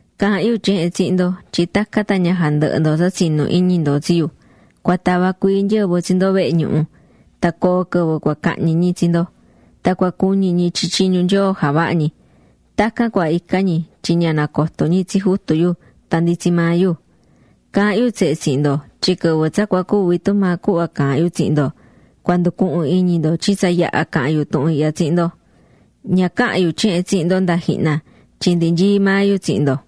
’Caahán yu tyehen tsihin ndo tyin tacan tan ña jandɨhɨ ndo tsa tsinú iñi ndo tsi yu. Cua tava cuii nyɨvɨ tsi ndo vehe ñuhu. Tan coo quɨvɨ cua cahñi ñi tsi ndo, tan cua cuñi ñi tyin tyiñu Nyoo javahá ñi. Tacan cua ica ñi tyin ña nacoto ñi tsi Jutu yu tan ndi tsi maa yu. Caahán yu tsehe tsihin ndo tyin quɨvɨ tsa cua cuvi tumaa cuhva caahán yu tsihin ndo, cua nducuhun iñi ndo tyin tsa yaha̱ caha̱n yu tuhun ihya tsihin ndo. ’Ña caha̱n yu tyehen tsihin ndo nda jihna tyin ndi nyií maa yu tsihin ndo.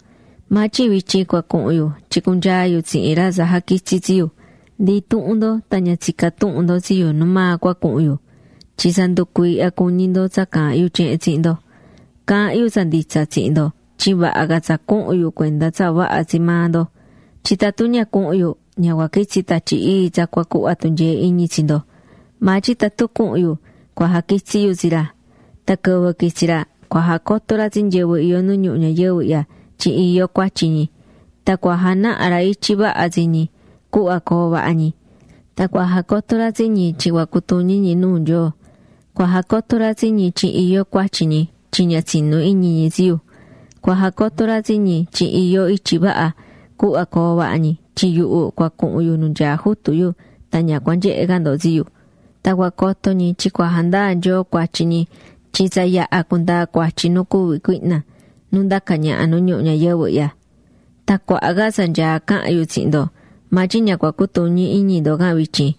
Maa tyin vityin cua cuhun yu tyin cunyaa yu tsihin ra tsa jaquitsi̱ tsi yu. Ndi intuhun ndo tan ña tsicá tuhun ndo tsi yu nu maa cua cuhun yu. Tyin tsa nducuiihya cuñi ndo tsa caahán yu tyehen tsihin ndo. Caahán yu tsa nditsa tsihin ndo tyin vaha ca tsa cuhun yu cuenda tsa vaha tsi maa ndo. Tyin tatun ña cuhun yu, ña cua quitsi Tatyi Ii tsa cua cuhva tunyee iñi tsi ndo. Maa tyin tatun cuhun yu, cua jaquitsi yu tsi ra. Tan quɨvɨ quitsi ra, cua jacoto ra tsi nyɨvɨ iyó nu ñuhu ñayɨvɨ ihya tyin iyó cuatyi ñi. Tan cua janaha ra ityi vaha tsi ñi, cuhva coo vaha ñi. Tan cua jacoto ra tsi ñi tyin cua cutuñi ñi nuu Nyoo. Cua jacoto ra tsi ñi tyin iyó cuatyi ñi tyin ña tsinú iñi ñi tsi yu. Cua jacoto ra tsi ñi tyin iyó ityi vaha, cuhva coo vaha ñi tyin yuhu cua cuhun yu nu nyaá Jutu yu tan ña cua nyehe ca ndo tsi yu. Tan cua coto ñi tyin cua jandaa Nyoo cuatyi ñi tyin tsa yaha̱ cundaa̱ cuatyi nu cuví cuihna, nu ndacá ñaha nu ñuhu ñayɨvɨ ihya. ’Tan cuaha ca tsa nyaá cahan yu tsihin ndo, maa tyin ña cua cutuñi iñi ndo can vityin.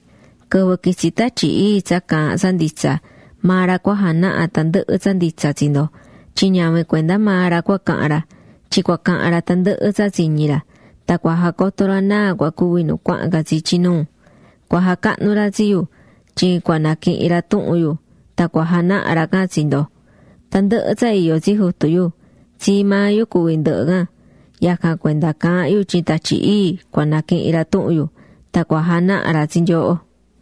Quɨvɨ quitsi Tatyi Ii tsa caahán tsa nditsa, maa ra cua janaha tandɨhɨ tsa nditsa tsi ndo. Tyin ñavin cuenda maa ra cua cahan ra, tyin cua cahan ra tandɨhɨ tsa tsiñí ra. Tan cua jacoto ra náa cua cuvi nu cuahán ca tsi ityi nuu. Cua jacahnu ra tsi yu, tyin cua naquihin ra tuhun yu tan cua janaha ra can tsi ndo. Tandɨhɨ tsa iyó tsi Jutu yu, tsii maa yu cuví ndɨhɨ can. Yacan cuenda caahán yu tyin Tatyi Ii cua naquihin ra tuhun yu, tan cua janaha ra tsi nyooho.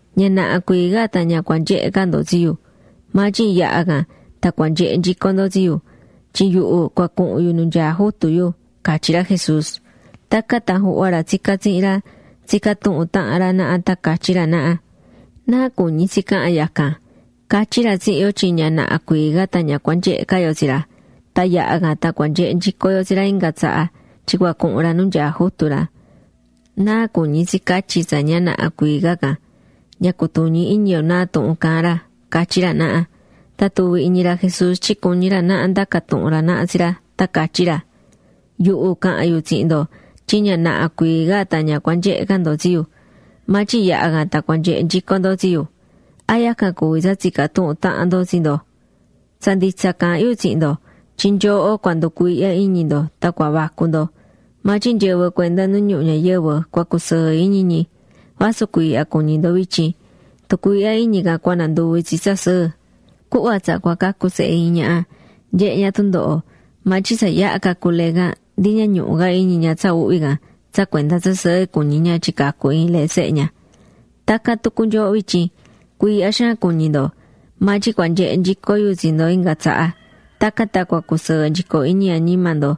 ’Ña naha cuii ca tan ña cua nyehe ca ndo tsi yu, maa tyin yaha can tan cua nyehe nyico ndo tsi yu, tyin yuhu cua cuhun yu nu nyaá Jutu yu ―catyí ra Jesús. Tacan tan juhva ra tsicá tsihin ra, tsicá tuhun tahan ra naha tan catyí ra naha: ―¿Náa cuñi tsi cahan yacan? Catyí ra tsihin yo tyin ña naha cuii ca tan ña cua nyehe ca yo tsi ra, tan yaha can tan cua nyehe nyico yo tsi ra inga tsaha tyin cua cuhun ra nu nyaá Jutu ra. ¿Náa cuñí tsi catyi tsa “ña naha cuii ca” can? Ña cutuñí iñi yo náa tuhun caahán ra ―catyí ra naha. Tan tuvi̱ iñi ra Jesús tyin cuñí ra naha ndaca tuhun ra naha tsi ra, tan catyí ra: ―Yuhu caha̱n yu tsihin ndo tyin ña naha cuii ca tan ña cua nyehe ca ndo tsi yu, maa tyin yaha can tan cua nyehe nyico ndo tsi yu. ¿A yacan cuví tsa tsicá tuhun tahan ndo tsi ndo? Tsa nditsa caahán yu tsihin ndo tyin nyooho cua nducuiihya iñi ndo tan cua vacu ndo, maa tyin nyɨvɨ cuenda nu ñuhu ñayɨvɨ cua cusɨɨ iñi ñi. Vasu cuiihya cuñí ndo vityin, tucuiihya iñi can cua nanduvi tsi tsa sɨɨ. Cuhva tsa cua cacu sehe iin ñaha, nyehé ña tundoho. Maa tyin tsa yaha cacu lee can, ndi ña ñuhu ca iñi ña tsa uhvi can tsa cuenda tsa sɨɨ cuñí ña tyin cacu̱ iin lee sehe ña. Tacan tucu nyooho vityin, cuiihya xaan cuñí ndo. Maa tyin cua nyehe nyico yu tsi ndo inga tsaha. Tacan tan cua cusɨɨ nyico iñi añima ndo.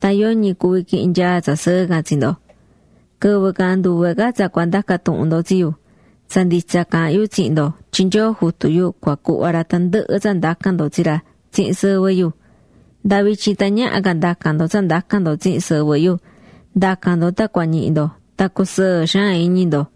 Tan yoñi cuví quihin nyaa tsa sɨɨ can tsi ndo. ’Quɨvɨ can nduve ca tsa cua ndaca tuhun ndo tsi yu. Tsa nditsa caahán yu tsihin ndo tyin Nyoo Jutu yu cua cuhva ra tandɨhɨ tsa ndacan ndo tsi ra tsihin sɨvɨ yu. Nda vityin tan ñaha ca ndacan ndo tsa ndacan ndo tsihin sɨvɨ yu. Nda̱can ndo tan cua ñihi ndo tan cusɨɨ xaan iñi ndo.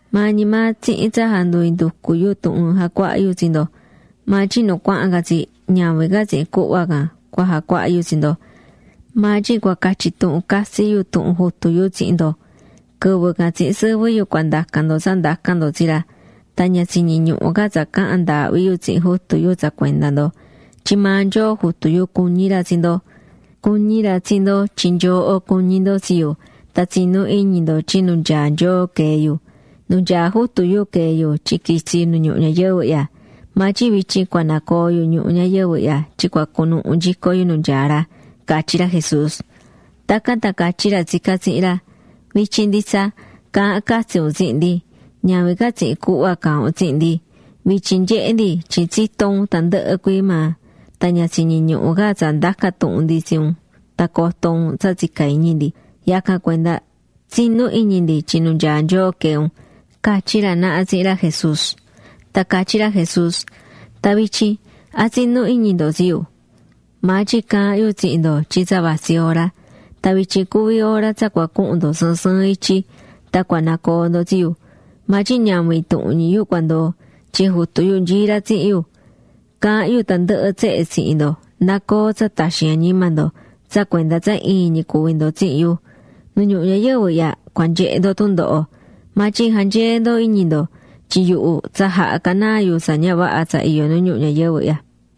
’Maa ñi maa tsihin tsa jandu inducú yu tuhun jacuahá yu tsi ndo. Maa tyin nu cuahán ca tsi, ñavin ca tsihin cuhva can cua jacuaha yu tsi ndo, maa tyin cua catyi tuhun catsi yu tuhun Jutu yu tsihin ndo. Quɨvɨ can tsihin sɨvɨ yu cua ndacan ndo tsa ndacan ndo tsi ra. Tan ña tsiñí ñuhu ca tsa cahan ndaahvi yu tsihin Jutu yu tsa cuenda ndo. Tyin maa Nyoo Jutu yu cuñí ra tsi ndo. Cuñí ra tsi ndo tyin nyooho cuñí ndo tsi yu, tan tsinú iñi ndo tyin nu nyaá Nyoo quee̱ yu. Nu nyaá Jutu yu quee̱ yu tyin quitsi̱ yu nu ñuhu ñayɨvɨ ihya. Maa tyin vityin cua nacoo yu ñuhu ñayɨvɨ ihya tyin cua cunuhu nyico yu nu nyaá ra ―catyí ra Jesús. Tacan tan catyí ra tsicá tsihin ra: ―Vityin nditsa, caahán catsi un tsihin ndi. Ñavin ca tsihin cuhva caahán un tsihin ndi. Vityin nyehé ndi tyin tsitó un tandɨhɨ cuii maa, tan ña tsiñí ñuhu ca tsa ndaca tuhun ndi tsi un tan coto un tsa tsicá iñi ndi. Yacan cuenda tsinú iñi ndi tyin nu nyaá Nyoo quee̱ un ―catyí ra naha tsihin ra Jesús. Tan catyí ra Jesús: ―Tan vityin ¿a tsinú iñi ndo tsi yu? Maa tyin caahán yu tsihin ndo tyin tsa vatsí hora. Tan vityin cuví hora tsa cua cuhun ndo sɨɨn sɨɨn ityi. Tan cua nacoo ndo tsi yu. Maa tyin ñavin intuhun ñi yu cua ndoo, tyin Jutu yu nyaá ra tsihin yu. Caahán yu tandɨhɨ tsehe tsihin ndo na coo tsa taxin añima ndo tsa cuenda tsa iin ñi cuví ndo tsihin yu. Nu ñuhu ñayɨvɨ ihya cua nyehe ndo tundoho, maa tyin ja̱nyee ndo iñi ndo, tyin yuhu tsa jaha̱ canaa yu tsa ña vaha tsa iyó nu ñuhu ñayɨvɨ ihya.